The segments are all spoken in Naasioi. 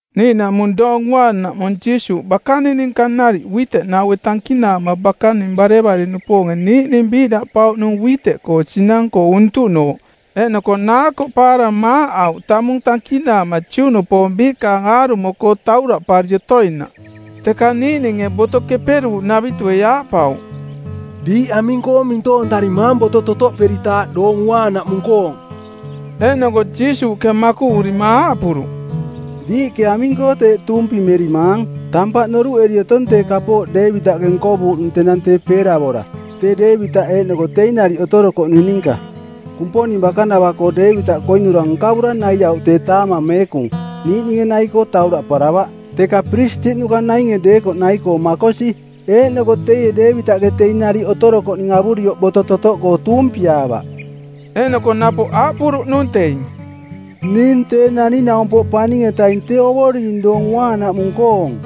Niiꞌnaꞌmung Doong Uaanaꞌmung Jiisuuꞌ bakaning ninka nariꞌ uiteꞌnaue˜ tankinaama bakaninge barevare-nupoonge niiꞌning biiꞌdaꞌpauꞌnung uiteꞌkoong sinang-koo untuꞌnooꞌ, eeꞌnoko naakoꞌpaara maaꞌauꞌ tamung tankinaama Juꞌnupoong biikaang aarumo-koo tauraꞌpari otoinaꞌ. Teka niiꞌninge Boto Keperuuꞌnavitue˜ aaꞌpauꞌ, “Diiꞌ aming-koo mintoontarimaang boto totoꞌperitaaꞌ Doong Uaanaꞌmung-koong?” Eeꞌnoko Jiisuuꞌke makuꞌurima aaꞌpuruꞌ, “Diiꞌke aming-koo teeꞌ tuumpimerimaang? Tampaꞌ noruꞌeri otong tee kapooꞌ Deevitaꞌke nkovuuꞌnung tenang tee peeravora, tee Deevitaꞌ eeꞌnoko teing nariꞌ otorokoꞌning ninka. Kumponing bakanava-koo Deevitaꞌke koinura nkavura naiauꞌ tee taamang meekung, niiꞌninge nai-koo tauraꞌparavaꞌ, teka piristiꞌnuka nainge deekoꞌ nai-koo makosi. Eeꞌnoko teie Deevitaꞌke teing nariꞌ otorokoꞌning avurioꞌ boto totoꞌkoo tuumpiaavaꞌ.” Eeꞌnoko napoꞌ aaꞌpuruꞌnung teing, “Ning Tee Naning-naumpoꞌ Paning-etaing tee Ovoring Doong Uaanaꞌmung-koong.”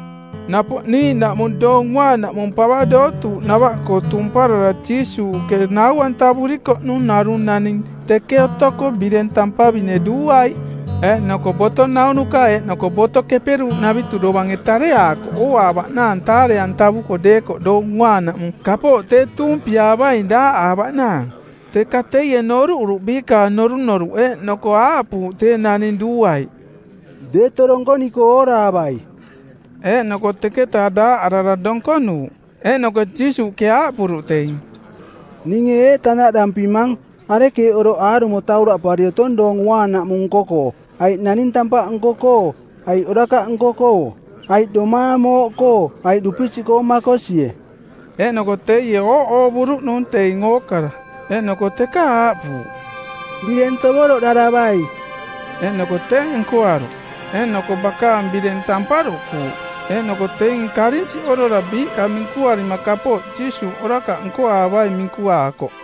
Napoꞌ niiꞌnaꞌmung Doong Uaanaꞌmung pava dootuuꞌnava-koo tumparara Jiisuuꞌke nau-antavurikoꞌnung narung naning teke otoko bireng tampavine duuaiꞌ. Eeꞌnoko boto naunuka eeꞌnoko Boto Keperuuꞌnavitu dovange tareaakoꞌ ooaavaꞌnaang taare-antavuko deekoꞌ Doong Uaanaꞌmung kapooꞌ tee tuumpiaavaing daaꞌaavaꞌnaang. Teka teie noruꞌuruꞌ biikaang norunoruꞌ eeꞌnoko aaꞌpuuꞌ tee naning duuaiꞌ, “Deto donkoniko ooraavai.” Eeꞌnoko teketa daaꞌarara donkonuuꞌ. Eeꞌnoko Jiisuuꞌke aaꞌpuruꞌ teing, “Ninge eeꞌ tanaꞌdampimang: Arekeeꞌ oroꞌ aarumo tauraꞌpari otong Doong Uaanaꞌmung nko-koo, aiꞌ naning tampaꞌ nko-koo aiꞌ orakaꞌ nko-koo; aiꞌ domaang mooꞌkoo aiꞌ dupisiꞌkoo makosie?” Eeꞌnoko teie ooꞌoovuruꞌnung teing ookara, eeꞌnoko teka aaꞌpuuꞌ, “Bireng tovoroꞌdaravai.” Eeꞌnoko teeꞌ nkoaruꞌ, eeꞌnoko bakaang bireng tamparuꞌkuuꞌ. Eeꞌnoko teing karinsiꞌorora biiꞌka minkuarima kapooꞌ Jiisuuꞌkoo orakaꞌ nkoaavaing minkuaakoꞌ.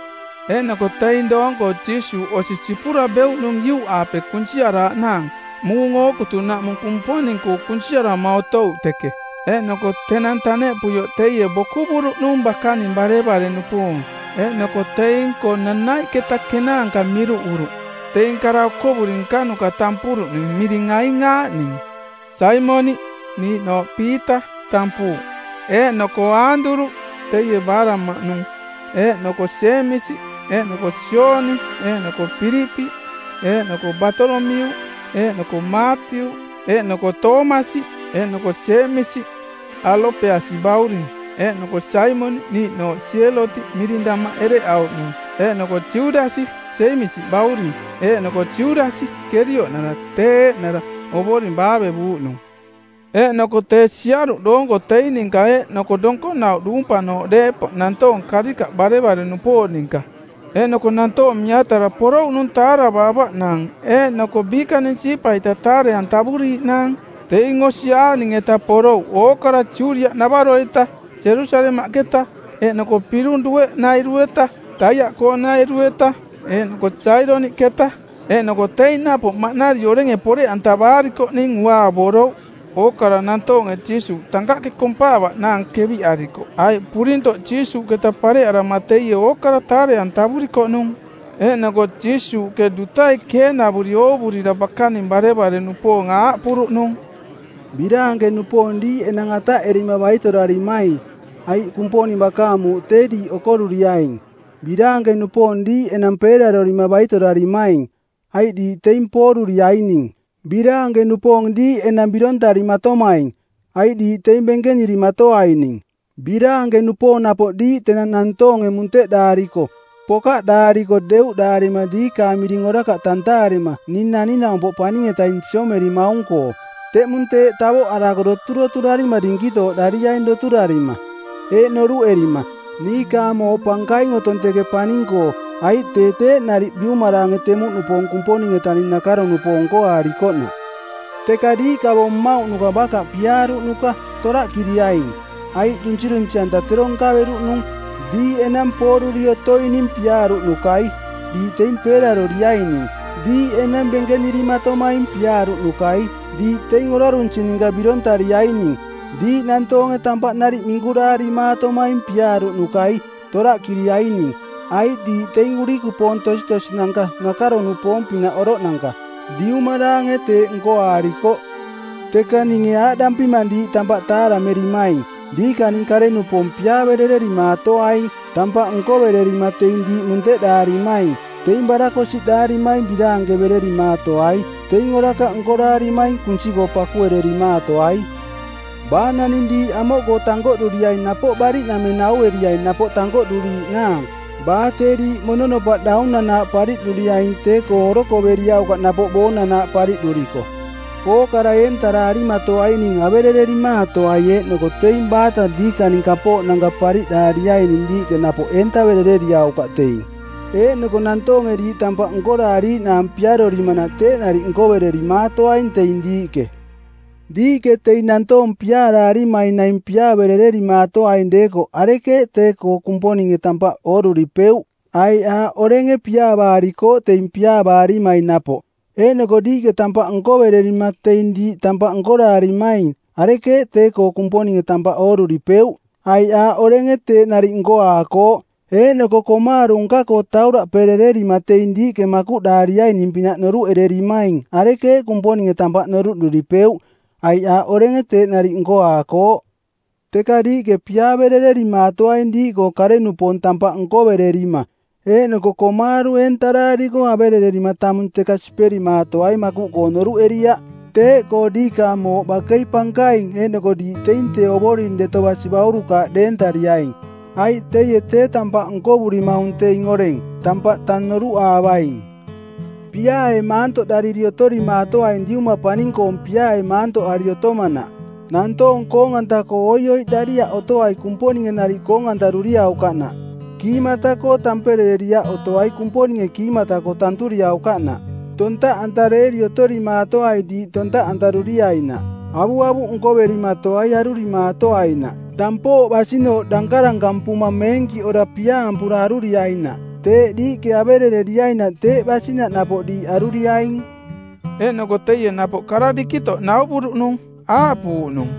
Eeꞌnoko teing doong-koo Jiisuuꞌ osi sipura beuꞌnung iuꞌaape kunsiaraaꞌnaang; muung ookutunaꞌmung Kumponing-koo kunsiarama otouꞌ teke. Eeꞌnoko tenang taneꞌpuioꞌ teie bokuvuruꞌnung bakaning barevare-nupoong eeꞌnoko teing-koo nanaiꞌketa kenaanka miruꞌuruꞌ, teing kara okovuri nkanuka tampuruꞌning, miring aing aaꞌning: Saimoniꞌ, niiꞌnooꞌ Piita tampuuꞌ, eeꞌnoko Aanduruꞌ, teie baaraꞌmaꞌnung, eeꞌnoko Jeemisi, eeꞌnoko Jooni, eeꞌnoko Pilipiꞌ, eeꞌnoko Baatolomiuꞌ, eeꞌnoko Maatiuꞌ, eeꞌnoko Toomasi, eeꞌnoko Jeemisi, Alopeasi bauring, eeꞌnoko Saimoniꞌ, niiꞌnooꞌ Sielotiꞌ miring damaꞌ ereꞌauꞌnung, eeꞌnoko Judasi, Jeemisi bauring, eeꞌnoko Judasi, Kerioꞌnara, tee eeꞌnara Ovoring baavevuuꞌnung. Eeꞌnoko tee siaruꞌ doonko teing ninka, eeꞌnoko donkonauꞌ duumpanooꞌ deepoꞌ nantoong karikaꞌ barevare-nupoong ninka. Eeꞌnoko nantoong miatara porouꞌnung taaravaavaꞌnaang eeꞌnoko biikaning siipa-ita taare-antavuriiꞌnaang. Teing osi aaꞌning-eta porouꞌ: ookara Judiaꞌnavaro-eta, Jerusalemaꞌketa eeꞌnoko pirung dueꞌnairu-eta (Taiaꞌkoonairu-eta eeꞌnoko Saidoniꞌketa). Eeꞌnoko teing napoꞌ maꞌnari orenge poreꞌantavaarikoꞌning unaavorouꞌ. Ookara nantoonge Jiisuuꞌ tankaꞌke kompaavaꞌnaang keviꞌarikoꞌ aiꞌ purintoꞌ Jiisuuꞌketa pareꞌarama teie ookara taare-antavurikoꞌnung. Eeꞌnoko Jiisuuꞌke dutai keenavuri oovurira bakaning barevare-nupoong aaꞌpuruꞌnung, “Biraanke-nupoong diiꞌ enang ataꞌerima baitorarimaing, aiꞌ Kumponing bakaang muuꞌ tee diiꞌ okoruriaing. “Biraanke-nupoong diiꞌ enang peerarorima baitorarimaing, aiꞌ diiꞌ teing pooruriaining. “Biraanke-nupoong diiꞌ enang birontarimatomaing, aiꞌ diiꞌ teing benkenirimatoaining. “Biraanke-nupoong napoꞌ diiꞌ tenang nantoonge munteꞌdaariko, pokaꞌdaariko deuꞌdaarima diikaang miring orakaꞌ tantaarima ning Naning-naumpoꞌ Paning-etaing siomerimaung-koo. Teꞌmung teeꞌ tavoꞌarako doturoturariritaaꞌ dinkitooꞌdariaing doturoturarima, eeꞌ noruꞌerima, ‘Niikaang mooꞌ pankaing otong teke paning-koo,’ aiꞌ tee teeꞌ nariꞌ biumaraange temuꞌnupoong Kumponing-etaing nakaro-nupoong nkoaarikoꞌnaꞌ. “Teka diiꞌ kavo mmauꞌnuka bakaꞌ piaaruꞌnuka, toraꞌkiriaing, aiꞌ dunsirunsi-anta˜ tero nkaveruꞌnung. “Diiꞌ enang pooruri otoining piaaruꞌnukai, diiꞌ teing peeraroriaining. “Diiꞌ enang benkenirimatomaing piaaruꞌnukai, diiꞌ teing orarunsi ninka birontariaining. “Diiꞌ nantoonge tampaꞌ nariꞌ minkuraarimaatomaing piaaruꞌnukai, toraꞌkiriaining, aiꞌ diiꞌ teing urikupoong tositosinanka nakaro-nupoong-pinaꞌ oroꞌnanka. Diumaraange teeꞌ nkoaarikoꞌ.” “Teka ninge aaꞌdampimang diiꞌ tampaꞌ taaramerimaing: Diikaning kare-nupoong piaaverererimaatoaing, tampaꞌ nkovererima teing diiꞌ munteꞌdaarimaing. Teing barakosiꞌdaarimaing biraanke-antavererimaatoai. Teing orakaꞌ nkoraarimaing kunsi-koo pakuererimaatoai. Baa naning diiꞌ amoꞌkoo tankoꞌduriaing napoꞌ bariꞌnameng naueriai napoꞌ tankoꞌduriiꞌnaang. Baa tee diiꞌ mononopaꞌ daunanaaꞌ pariꞌduriaing tee-koo orokoveriaukaꞌ napoꞌ boonanaaꞌ pariꞌduriko. Ookara eentaraarimaatoaining averererimaatoai eeꞌnoko teing baata diikaning kapooꞌnanka pariꞌdaariaining diiꞌke napoꞌ eentaverereriaukaꞌ teing. Eeꞌnoko nantoonge diiꞌ tampaꞌ nkoraariiꞌnaang piarorimanaꞌ teeꞌ nariꞌ nkovererimaatoaing teing diiꞌke. Diiꞌke teing nantoong piaaraarimaing naing piaaverererimaatoaing deekoꞌ arekeeꞌ tee-koo Kumponinge tampaꞌ ooruripeuꞌ? Aiꞌ aaꞌ orenge piaavaarikooꞌ teing piaavaarimaing napoꞌ. Eeꞌnoko diiꞌke tampaꞌ nkovererima teing diiꞌ tampaꞌ nkoraarimaing arekeeꞌ tee-koo Kumponinge tampaꞌ ooruripeu? Aiꞌ aaꞌ orenge teeꞌ nariꞌ nkoaakooꞌ. Eeꞌnoko komaaru˜ nka-koo tauraꞌperererima teing diiꞌke makuꞌdaariaining-pinaꞌ noruꞌererimaing arekeeꞌ Kumponinge tampaꞌ noruꞌduripeuꞌ, aiꞌ aaꞌ orenge teeꞌ nariꞌ nkoaakooꞌ. Teka diiꞌke piaaverererimaatoaing diiꞌkoo kare-nupoong tampaꞌ nkovererima, eeꞌnoko komaaru eentaraariko averererima tamung teka siperimaatoai makuꞌkoo noruꞌeriaꞌ. Teeꞌkoo diikaang mooꞌ bakei pankaing eeꞌnoko diiꞌ teing tee Ovoring Deto Basi baurukaaꞌ deentariaing, aiꞌ teie tee tampaꞌ nkovurimaung teing oreng, tampaꞌ tang noruꞌaavaing. Piaae maantoꞌdariri otorimaatoaing Diuma paning-koong piaae maantoꞌari otomanaꞌ. Nantoong koong-anta-koo oioiꞌdariaꞌ otoai Kumponinge nariꞌ koong-antaruriaukaꞌnaꞌ. Kiimata-koo tamperereriaꞌ otoai Kumponinge kiimata-koo tanturiaukaꞌnaꞌ. Tontaꞌantareeri otorimaatoai diiꞌ tontaꞌantaruiainaꞌ. Avuavuꞌ nkoverimatoai arurimaatoainaꞌ. Tampooꞌ basinooꞌ dankarankampuma meenkiꞌora piaampura aruriainaꞌ. Teeꞌ diiꞌke avereriainaꞌ teeꞌ basinaꞌ napoꞌ diiꞌ aruriaing.” Eeꞌnoko teie napoꞌ kara dikitoꞌ nauvuruꞌnung, aaꞌpuuꞌnung,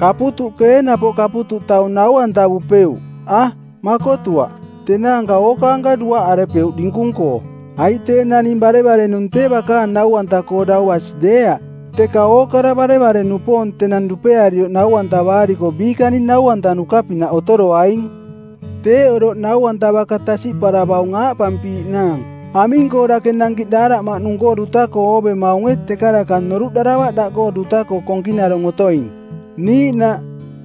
“Kaputuꞌke ee napoꞌ kaputuꞌ taung nau-antavupeuꞌ? A, makotuaꞌ. Tenaanka ookaanka duaꞌarepeuꞌ dinkung-koo. Aiꞌ tee naning barevare-nung tee bakaang nau-anta-koo dau basi deeaꞌ, teka ookara barevare-nupoong tenang dupearioꞌ nau-antavaariko biikaning nau-antanuka-pinaꞌ otoroaing. Teeꞌ oroꞌ nau-anta baka tasiꞌparavaung aaꞌpampiiꞌnaang, ‘Aming-koo dake nankiꞌ daaraꞌmaꞌnung-koo duta-koo oovemaunge teka daka noruꞌdaravaꞌ daꞌkoo duta-koo konkinarong otoing?’ Niiꞌnaꞌ,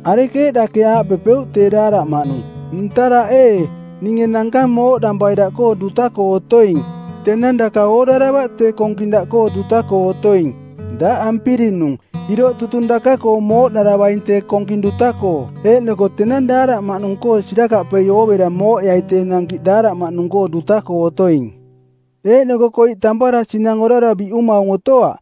‘Arekeeꞌ dake aaꞌpepeuꞌ tee daaraꞌmaꞌnung, “Ntaraꞌ ee, ninge nankang mooꞌdampai daꞌkoo duta-koo otoing,” tenang daka ooraravaꞌ tee konking daꞌkoo duta-koo otoing. Daꞌ ampirinung˜, iroꞌ tutung daka-koo mooꞌdaravaing tee konking duta-koo eeꞌnoko tenang daaraꞌmaꞌnung-koo sirakaꞌpei oovera mooꞌeai tee nankiꞌ daaraꞌmaꞌnung-koo duta-koo otoing.’ “Eeꞌnoko koiꞌ tampara sinang orara biꞌumaung otoaꞌ,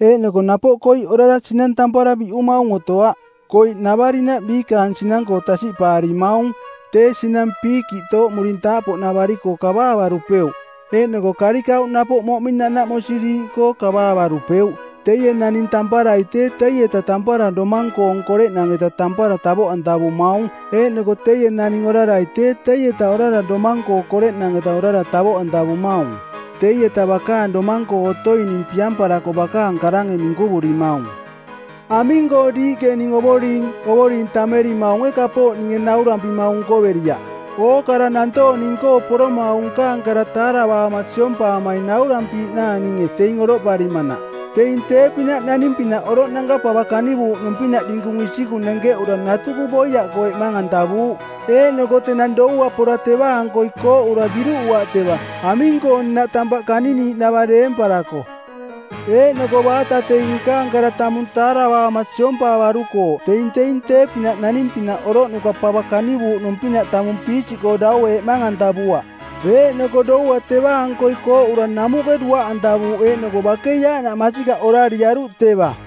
eeꞌnoko napoꞌ koiꞌ orara sinang tampara biꞌumaung otoaꞌ. Koiꞌnavarinaꞌ biikaang sinang-koo tasiꞌpaarimaung. Tee sinang piikiꞌ tooꞌmurintaaꞌpoꞌnavari-koo kavaavarupeuꞌ, eeꞌnoko karikauꞌ napoꞌ moꞌming nanaꞌmosiriiꞌkoo kavaavarupeuꞌ. Teie naning tamparai tee teieta tampara domang-koong koreꞌnang-eta tampara tavoꞌantavumaung eeꞌnoko teie naning orarai tee teieta orara domang-koong koreꞌnang-eta orara tavoꞌantavumaung, teieta bakaang domang-koo otoining piamparako bakaang karange minkuvurimaung.” “Aming-koo ning diiꞌke ‘Ovoring, Ovoring’ tammerimaunge kapooꞌ ninge naurampimaung nkoveriaꞌ? Ookara nantoong ning-koo poroma aung nkaang kara taaravaama siompaamaing naurampiiꞌnaang ninge, teing oroꞌparimanaꞌ. Teing tee-pinaꞌ naning-pinaꞌ oroꞌnanka pava kanivuuꞌnung-pinaꞌ dinkung isikung nenkeꞌura natuku boiaꞌkoo eꞌmang-antavuuꞌ. Eeꞌnoko tenang doua pora teva-ankoi kooꞌura biruꞌuaꞌ teva, aming-koo nnaꞌ tampaꞌ kaniniiꞌnava deemparako. Eeꞌnoko baata teing nkaang kara tamung taaravaama siompaavarukooꞌ teing teing tee-pinaꞌ naning-pinaꞌ oroꞌnuka pava kanivuuꞌnung-pinaꞌ tamung piisiꞌkoo dau eꞌmang-antavuaꞌ, eeꞌnoko doua teva-ankoi kooꞌura namuꞌke duaꞌantavuuꞌ eeꞌnoko bakei aaꞌnaꞌ masikaꞌ orariaruꞌ teva.”